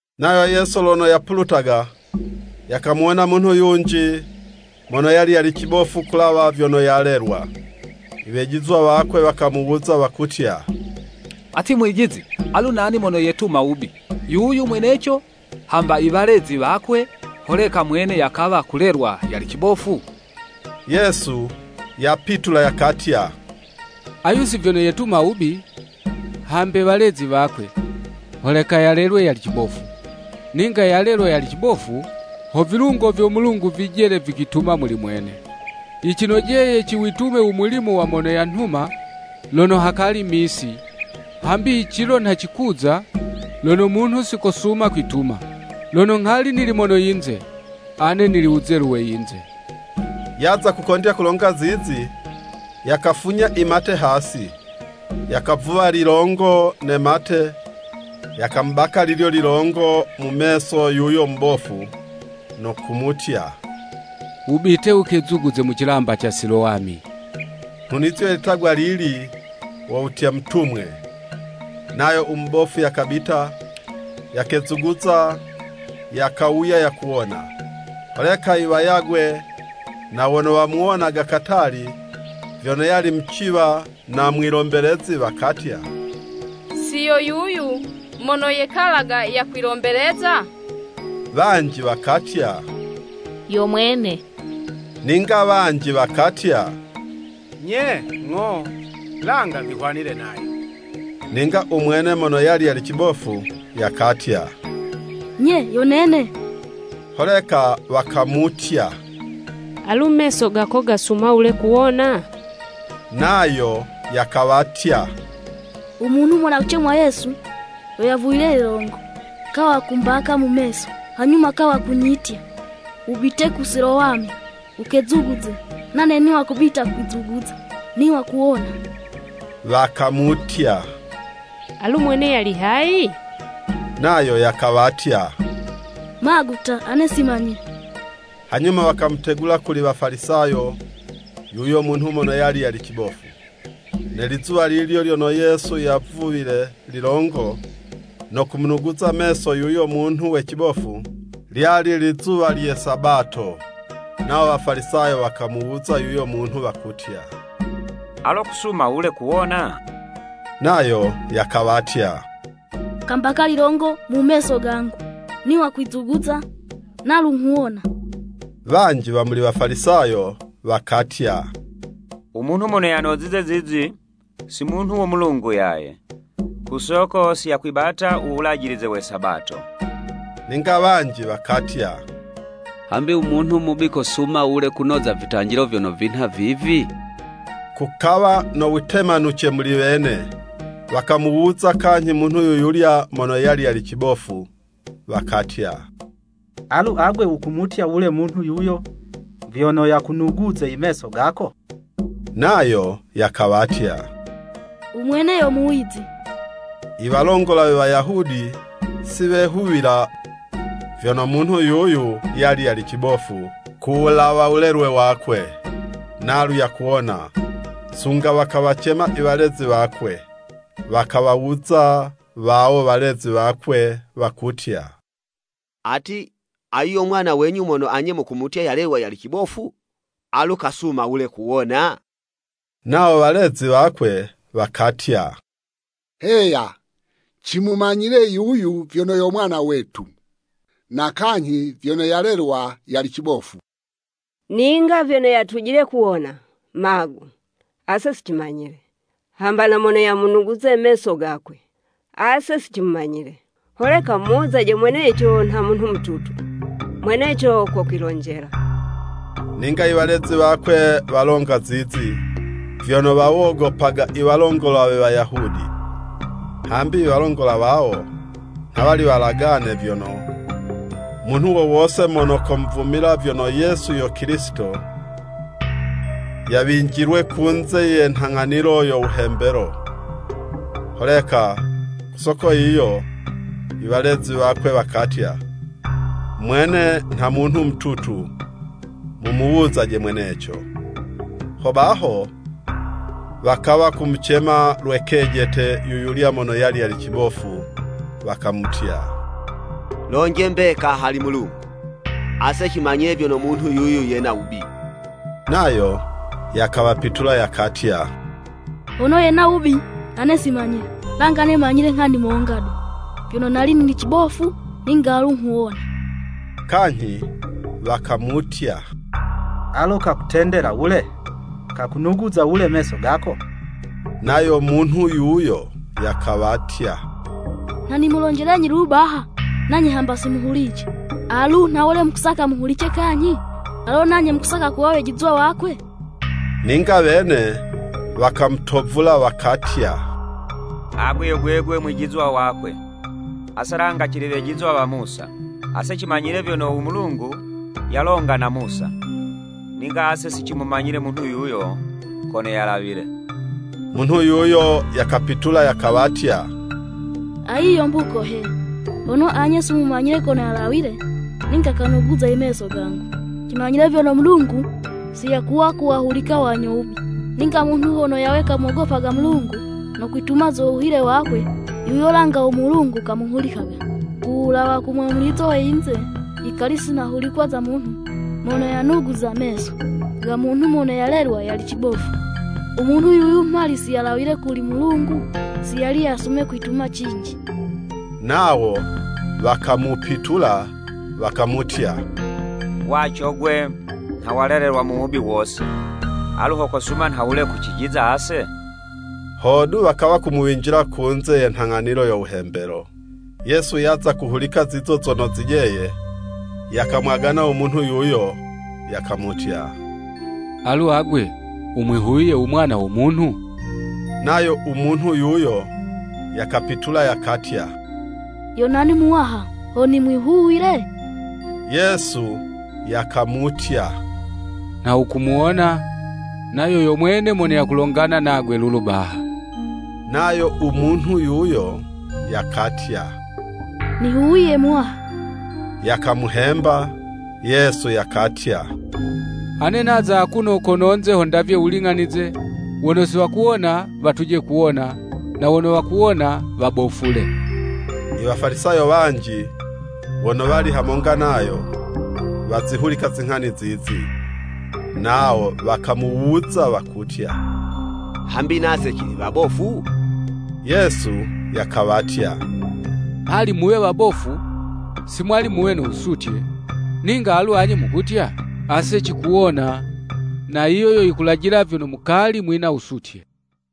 Nayo Yesu lono yapulutaga, yakamuwona munhu yunji, mono yali yali cibofu kuwulawa vyono yalelwa. Iwejizwa wakwe wakamuwuza wakutya, “Ati Mwijizi, alu nani mono yetuma wubi, yuyu mweneco, hamba i walezi wakwe, holeka mwene yakawa kulelwa yali cibofu?” Yesu yapitula yakatya, “Ayu si vyono yetuma wubi, hambe walezi wakwe, holeka yalelwe yali cibofu. Ninga yalelwa yali cibofu, ho vilungo vyo Mulungu vijele vikwituma muli mwene. Yicinojeye ciwitume u mulimo wa mono yanhuma lono hakali misi, hambi i cilo nha cikuza, lono munhu si kosuma kwituma. Lono nghali nili mono yinze, ane nili wuzelu we yinze.” Yaza kukondya kulonga zizi, yakafunya i mate hasi, yakavuwa lilongo ne mate, yakamubaka lilyo lilongo mu meso yuyo mubofu, no kumutya, “Wubite wukezuguze mu cilamba ca Silowami.” (nhunizo ye litagwa lili, wo wutya “Mutumwe.”) Nayo u mubofu yakabita, yakezuguza, yakawuya yakuwona. Holeka iwayagwe, na wono wamuwonaga katali, vyono yali muciwa na mwilombelezi, wakatya, “Si yo yuyu mono yekalaga yakwilombeleza?” Wanji wakatya, “Yo mwene.” Ninga wanji wakatya, “Nye, ng'o. Langa vihwanile nayo.” Ninga u mwene mono yali yali cibofu, yakatya, “Nye, yo nene.” Holeka wakamutya, “Alu meso gako gasuma wule kuwona?” Nayo yakawatya, “U Munhu mono yakucemwa Yesu, yo yavuwile lilongo, kawa kumbaka mu meso, hanyuma kawa kunyitya, ‘Wubite ku Silowami, ukezuguze,’ Nane niwa kubita kwizuguza, niwa kuwona.” Wakamutya, “Alu mwene yali hayi?” Nayo yakawatya, “Magu ta, ane si manyile.” Hanyuma, wakamutegula kuli Wafalisayo yuyo munhu mono yali yali cibofu. Ne lizuwa lilyo lyono Yesu yavuwile lilongo no kumunuguza meso yuyo munhu we cibofu, lyali lizuwa lye Sabato. Nawo Wafalisayo wakamuwuza yuyo munhu wakutya, “Alo kusuma wule kuwona?” Nayo yakawatya, “Kambaka lilongo mu meso, gangu, niwa kwizuguza, nalu nghuwona.” Wanji wa muli Wafalisayo, wakatya, “U munhu mono yanozize zizi, si munhu wo Mulungu yaye, ku soko si yakwibata u wulajilize we Sabato.” Ninga wanji wakatya, “Hambi u munhu mubi kosuma wule kunoza vitanjilo vyono vinha vivi?” Kukawa no witemanuce muli wene. Wakamuwuza kanyhi munhu yuyulya mono yali yali cibofu, wakatya, “Alu agwe wukumutya wule munhu yuyo vyono yakunuguze i meso gako?” Nayo yakawatya, “U Mwene yo Muwizi.” I walongola we Wayahudi si wehuwila vyono munhu yuyu yali yali cibofu kuwulawa wulelwe wakwe, nalu yakuwona, sunga wakawacema i walezi wakwe. Wakawawuza wawo walezi wakwe, wakutya, “Ati, ayu yo mwana wenyu mono anye mukumutya yalelwa yali cibofu?” Alu kasuma wule kuwona? Nawo walezi wakwe wakatya, “Heya, cimumanyile yuyu vyono yo mwana wetu, na kanyhi vyono yalelwa yali cibofu. Ninga vyono yatujile kuwona, magu, ase si cimanyile, hamba na mono yamunuguza meso gakwe, ase si cimumanyile. Holeka mumuwuzaje mweneco nha munhu mututu, mweneco kokwilonjela.” Ninga i walezi wakwe walonga zizi, vyono wawogopaga iwalongola we Wayahudi, hambi iwalongola wawo nha wali walagane vyono, munhu wo wose mono komuvumila vyono Yesu yo Kilisito, yawinjilwe kunze ye nhang'anilo yo wuhembelo. Holeka ku soko yiyo, iwalezi wakwe wakatya, “Mwene nha munhu mututu, mumuwuzaje mweneco.” Hobaho wakawa kumucema lwe kejete, yuyulya mono yali yali cibofu, wakamutya, “Lonje mbeka hali Mulungu! Ase cimanyile vyono munhu yuyu yena wubi.” Nayo yakawapitula yakatya, “Hono yena wubi, ane si manyile. Langa ane manyile nghani monga du, vyono, nali nili cibofu, ninga alu nghuwona.” Kanyhi wakamutya, “Alo kakutendela wule? Kakunuguza wule meso gako? Nayo munhu yuyo, yakawatya, nha nimulonjelenyi lulu baha, nanye hamba si muhulicize, alu nhawule mukusaka muhulice kanyhi? Alo nanye mukusaka kuwa wejizwa wakwe?” Ninga wene wakamutovula wakatya, “Agwe yo gwegwe mwijizwa wakwe, ase langa cili wejizwa wa Musa. Ase cimanyile vyono u Mulungu yalonga na Musa, ninga ase si cimumanyile munhu yuyo kono yalawile.” Munhu yuyo yakapitula yakawatya, “Ayi yo mbuko he, hono anye si mumumanyile kono yalawile, ninga kanuguza imeso gangu! Cimanyile vyono Mulungu si yakuwa kuwahulika wanyo wubi, ninga munhu hono yawe kamogopaga Mulungu no kwituma zo wuhile wakwe, yuyo langa u Mulungu kamuhulikaga. Ku wulawa ku mwamulizo we yinze, yikali si nahulikwa za munhu mono yanuguza meso, ga munhu mono yalelwa yali cibofu. U munhu yuyu mhali si yalawile kuli Mulungu, si yali yasume kwituma cinji.” Nawo wakamupitula wakumutya, “Waco 'gwe, nha walelelwa mu wubi wose, alu ho kosuma nhawule kucijiza ase?” Hodu wakawa kumuwinjila kunze ye nhang'anilo yo Wuhembelo. Yesu yaza kuhulika zizo zono zijeye, yakamwagana u munhu yuyo, yakamutya, “Alu agwe, wumwihuwiye u Mwana wo Munhu?” Nayo u munhu yuyo yakapitula yakatya, “Yo nani Muwaha, ho nimwihuwile?” Yesu yakamutya, “Nha wukumuwona, nayo yo mwene mono yakulongana nagwe lulu baha.” Nayo u munhu yuyo, yakatya, “Nihuwiye Muwaha.” Yakamuhemba. Yesu yakatya, “Ane naza akuno kononze ho ndavye wuling'anize, wono si wakuwona, watuje kuwona, na wono wakuwona, wabofule.” Iwafalisayo wanji wono wali hamonga nayo, wazihulika zinghani zizi, nawo wakamuwuza wakutya, “Hambi nase cili wabofu?” Yesu yakawatya, “Mhali muwe wabofu, si mwali muwe no wusutye, ninga alu anye mukutya, ase cikuwona, na yiyo yo yikulajila vyono mukali mwina wusutye.”